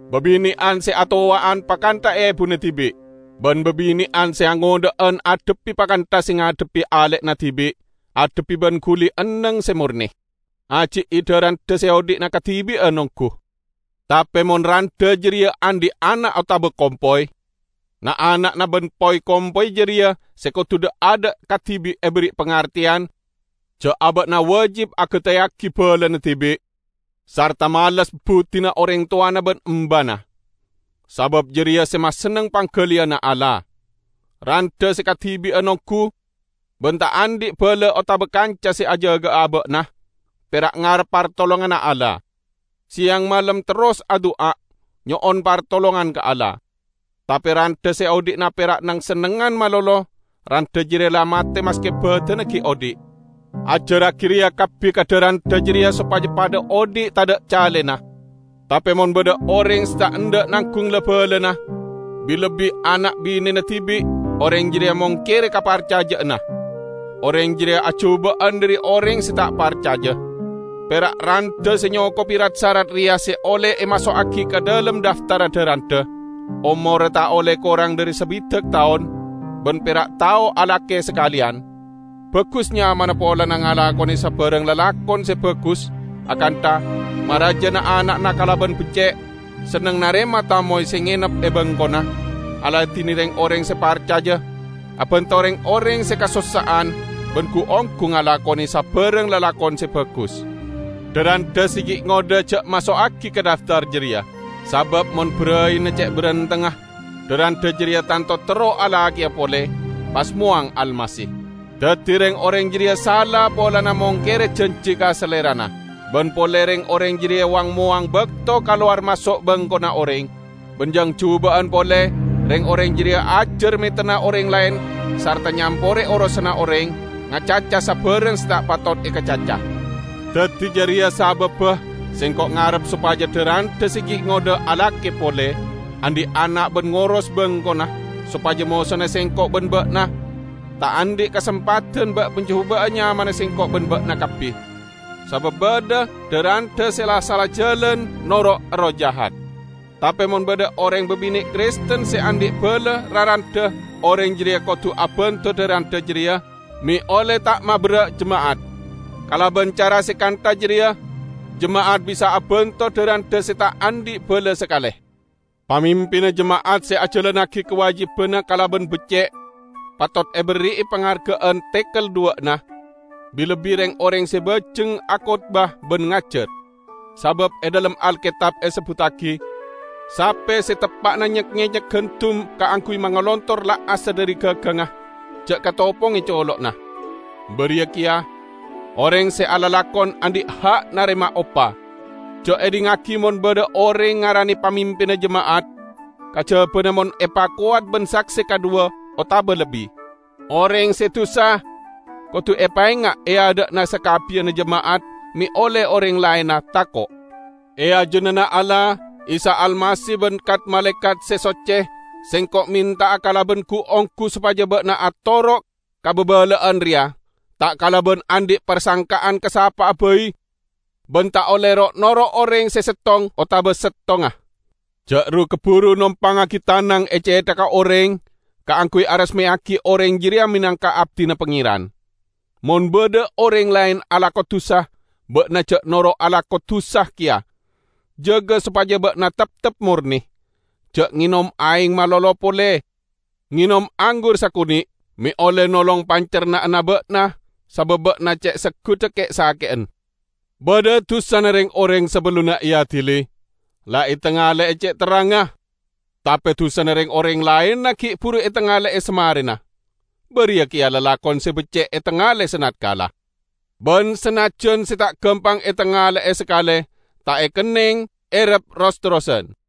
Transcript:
babine'an se atowa'an pakantha ebuna dibi'; ban babine'an se angodha'an adhebbi pakantha se ngadhebbi ale'na dibi', adhebbi ban guli enneng se morne. Aji'i dha-randha se odhi'na kadibi'an onggu. Tape mon randha jareya andhi' ana' otaba kompoy, na'-ana'na ban poy-kompoyya jareya se kodu dha'-adha' kadibi' eberri' pangarteyan ja' aba'na wajib agateyagi balana dibi', sarta males buddina oreng towana ban embana. Sabab jareya se masenneng panggaliyanna Allah. Randha se kadibi'an onggu, ban ta' andhi' bala otaba kanca se ajaga'a aba'na, pera' ngarep partolonganna Allah. Seyang malem terros adu'a nyo'on partolongan ka Allah. Tape randha se odhi'na pera' neng-sennengngan malolo, randha jareya la mate maske badanna gi' odhi'. Ajarragi reya kabbi ka dha-randha jareya sopaja padha odhi' tadha' calena. Tape mon badha oreng se ta' endha' nanggung la-balana, bi-lebbi ana' binena dibi', oreng jareya mongkere kaparcaja'anna; oreng jareya ajuba'an dhari oreng se ta' parcaja. Pera' randha se nyokobi rat-sarat reya se olle emaso'agi ka dhalem dhaftarra dha-randha: omorra ta' olle korang dhari sabidak taon, ban pera' tao alake sakaleyan; bagus nyamana polana ngalakone sabarang lalakon se bagus, akantha: maraja na'-ana'na kalaban becce', senneng narema tamoy se ngenep e bengkona, aladine reng-oreng se parcaja, abanto reng-oreng se kasossa'an, ban gu-onggu ngalakone sabarang lalakon se bagus. Dha-randha se gi' ngodha ja' maso'agi ka dhaftar jareya. Sabab mon baraina ce' barentengnga, dha-randha jareya tanto terro alakeya pole, pas mowang Almasih. Daddi reng-oreng jareya sala polana mongkere janji ka salerana. Ban pole reng-oreng jareya wang-mowang bakto kalowar maso' bengkona oreng. Ban jang juba'an pole, reng-oreng jareya ajar metenna oreng laen sarta nyampore orosanna oreng, ngacaca sabarang se ta' patot ekacaca. Daddi jareya sababba sengko' ngarep sopaja dha-randha se gi' ngodha alake pole, andhi' ana' ban ngoros bengkona, sopaja mosona sengko' ban ba'na ta' andhi' kasempadan ba'-majuba'a nyamana sengko' ban ba'na kabbi. Sabab badha dha-randha se la sala jalan noro' erroh jahat. Tape mon badha oreng babine' Kristen se andhi' bala la randha, oreng jareya kodu abanto dha-randha jareya; me' olle ta' maberra' jema'at. Kalaban cara se kantha jareya jema'at bisa abanto dha-randha se ta' andhi' bala sakale. Pamimpinna jema'at se ajalannagi kawajibanna kalaban becce', patot eberri'i pangarga'an tekel dhuwa'na, bi-lebbi reng-oreng se bajeng akotbah ban ngajar. Sabab e dhalem Alketab esebbuttagi, "Sape se teppa'na nyek-ngenyek gandum kaangguy mangalotor la'assa dhari gagangnga, ja' katoponge colo'na", bariya keya, "Oreng se alalakon andhi' ha' narema opa". Ja' edhingngagi mon badha oreng ngarane pamimpinna jema'at, kajabana mon epakowat ban sakse kadhuwa otaba lebbi. Oreng se dusa kodu epaenga' e adha'na sakabbiyanna jema'at me' olle oreng laenna tako'. E ajunanna Allah, Isa Almasih ban kat-malaekat se socce, sengko' menta'a kalaban gu-onggu sopaja ba'na atoro' ka babala'an reya, ta' kalaban andhi' parsangka'an ka sapa'a bai, ban ta' olle ro'-noro' oreng se settong otaba settongnga. Ja' ru-kaburu nompangngagi tanang e cethagga oreng kaangguy aresmeyagi oreng jareya menangka abdina Pangeran. Mon badha oreng laen alako dusa, ba'na ja' noro' alako dusa keya. Jaga sopaja ba'na teptep morne. Ja' ngenom aeng malolo pole, ngenom anggur sakone' me' olle nolong pancerna'anna ba'na, sabab ba'na ce' seggudda ke'-sake'en. Badha dusana reng-oreng sabellunna eadili, la etangale'e ce' terrangnga; tape dusana reng-oreng laenna gi' buru etangale'e samarena. Bariya keya lalakon se becce' etangale sanatkala. Ban sanajjan se ta' gampang etangale'e sakale, ta' ekenneng errep ros-terrosan.